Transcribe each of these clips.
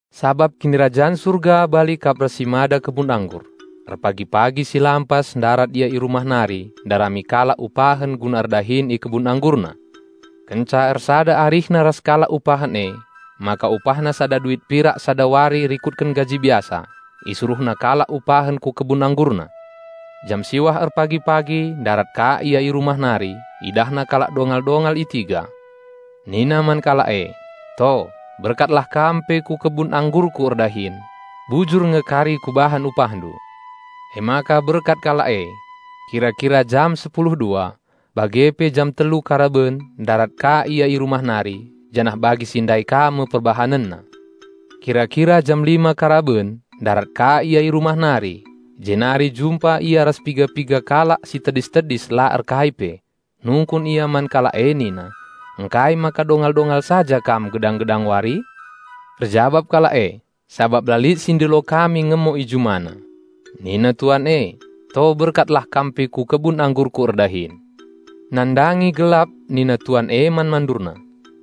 "Sabap Kinirajan Surga bali kap ras si mada kebun anggur. Erpagi-pagi si lampas ndarat ia i rumah nari ndarami kalak upahen guna erdahin i kebun anggurna. Kenca ersada arihna ras kalak upahen emaka upahna sada duit pirak sada wari rikutken gaji biasa, isuruhna kalak upahen ku kebun anggurna. Jam siwah erpagi-pagi ndarat ka ia i rumah nari, idahna kalak dongal-dongal i tiga. Nina man kalak e, 'To, berkatlah kam pe ku kebun anggurku erdahin. Bujur nge kari kubahan upahndu.' Emaka berkat kalak e. Kira-kira jam sepulu dua, bage pe jam telu karaben ndarat ka ia i rumah nari, janah bagi si ndai ka me perbahanenna. Kira-kira jam lima karaben ndarat ka ia i rumah nari, jenari jumpa ia ras piga-piga kalak si tedis-tedis la erkai pe. Nungkun ia man kalak e nina, 'Ngkai maka dongal-dongal saja kam gedang-gedang wari?' Erjabap kalak e, 'Sabap la lit si ngupahi erdahin i juma.' Nina tuan e, 'To berkatlah kam pe ku kebun anggurku erdahin.' Nandangi gelap nina tuan e man mandurna,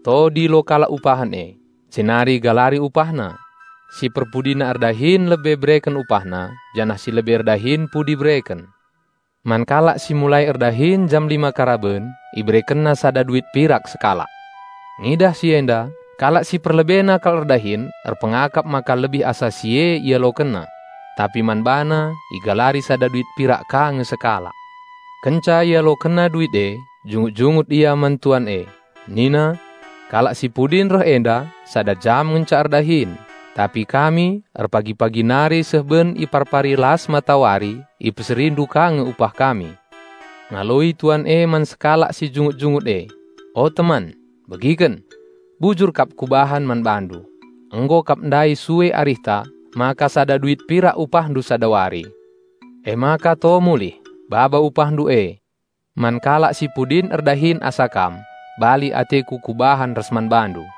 'To dilo kalak upahen e, jenari galari upahna; si perpudina erdahin lebe bereken upahna janah si lebe erdahin pudi bereken.' Man kalak si mulai erdahin jam lima karaben iberekenna sada duit pirak sekalak. Ngidah si enda, kalak si perlebena kal erdahin erpengakap maka lebih asa si e ialokenna. Tapi man bana igalari sada duit pirak ka nge sekalak. Kenca ialokenna duit e, jungut-jungut ia man tuan e. Nina, 'Kalak si pudin reh enda, sada jam ngenca erdahin, tapi kami erpagi-pagi nari seh ben iparpari las matawari ipeserindu ka nge upah kami.' Ngaloi tuan e man sekalak si jungut-jungut e, 'O teman, begiken! Bujur kap kubahan man bandu. Nggo kap ndai sue arihta maka sada duit pirak upahndu sada wari. Emaka to mulih, baba upahndu e. Man kalak si pudin erdahin asa kam, bali ateku kubahan ras man bandu.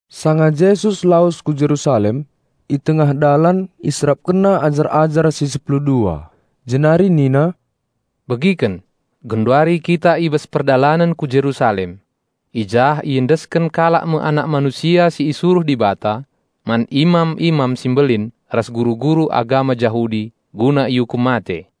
Sanga Jesus lawes ku Jerusalem, i tengah dalan IserapkenNa ajar-ajar si sepuludua, jenari nina, "Begiken! Genduari kita i bas perdalanen ku Jerusalem. I jah iendesken kalak me Anak Manusia si isuruh Dibata, man imam-imam si mbelin ras guru-guru agama Jahudi, guna iukum mate.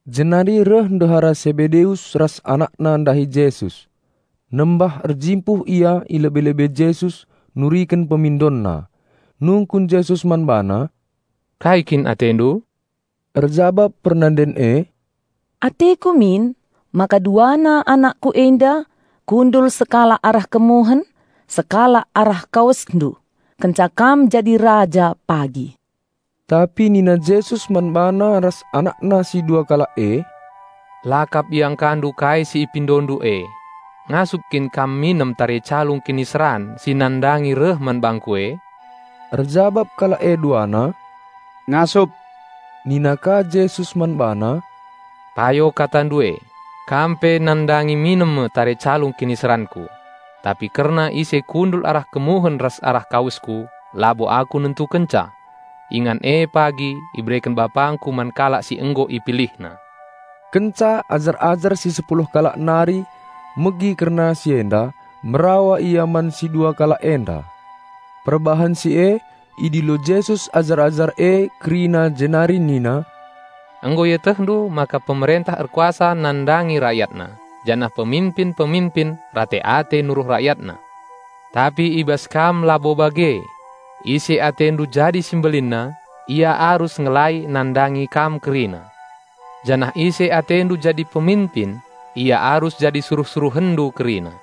Jenari reh ndehara Sebedeus ras anakna ndahi Jesus. Nembah-erjimpuh ia i lebe-lebe Jesus nuriken pemindonna. Nungkun Jesus man bana, "Kai kin atendu?" Erjabap pernanden e, "Ateku min maka duana anakku enda kundul sekalak arah kemuhen, sekalak arah KawesNdu, kenca Kam jadi Raja pagi." Tapi nina Jesus man bana ras anakna si dua kalak e, "La kap iangkandu kai si ipindondu e. Ngasup kin kam minem tare calung kiniseran si nandangi reh man bangKu e?" Erjabap kalak e duana, "Ngasup." Nina ka Jesus man bana, "Payo katandu e, kam pe nandangi minem me tare calung kiniseranKu. Tapi kerna ise kundul arah kemuhen ras arah kawesKu labo Aku nentukenca. Ingan e pagi ibereken BapangKu man kalak si nggo IpilihNa." Kenca ajar-ajar si sepuluh kalak nari megi kerna si enda, merawa ia man si dua kalak enda. Perbahan si e idilo Jesus ajar-ajar e kerina jenari nina, "Nggo ietehndu maka pemerentah erkuasa nandangi rayatna janah peminpin-peminpin rate-ate nuruh rayatna. Tapi i bas kam labo bage. Ise i atendu jadi si mbelinna, ia arus ngelai nandangi kam kerina; janah ise atendu jadi peminpin, ia arus jadi suruh-suruhenndu kerina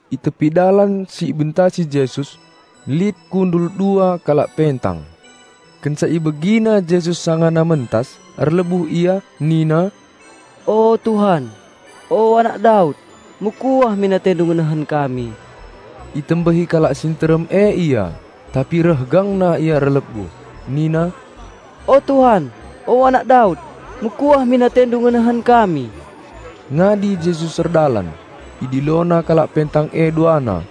I tepi dalan si ibentasi Jesus lit kundul dua kalak pentang. Kenca ibegina Jesus sangana mentas erlebuh ia nina, "O, Tuan! O, Anak Daud! Mekuah min atendu ngenehen kami." Itembehi kalak si nterem e ia, tapi reh gangna ia erlebuh nina, "O, Tuan! O, Anak Daud! Mekuah min atendu ngenehen kami." Ngadi Jesus erdalan, IdiloNa kalak pentang e duana.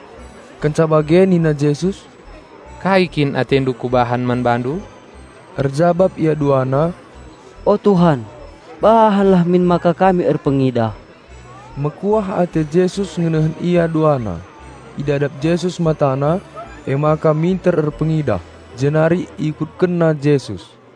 Kenca bage nina Jesus, "Kai kin atendu Kubahan man bandu?" Erjabap ia duana, "O, Tuan, bahanlah min maka kami erpengidah!" Mekuah ate Jesus ngenehen ia duana. Idadap Jesus matana, emaka minter erpengidah, jenari ikutkenna Jesus.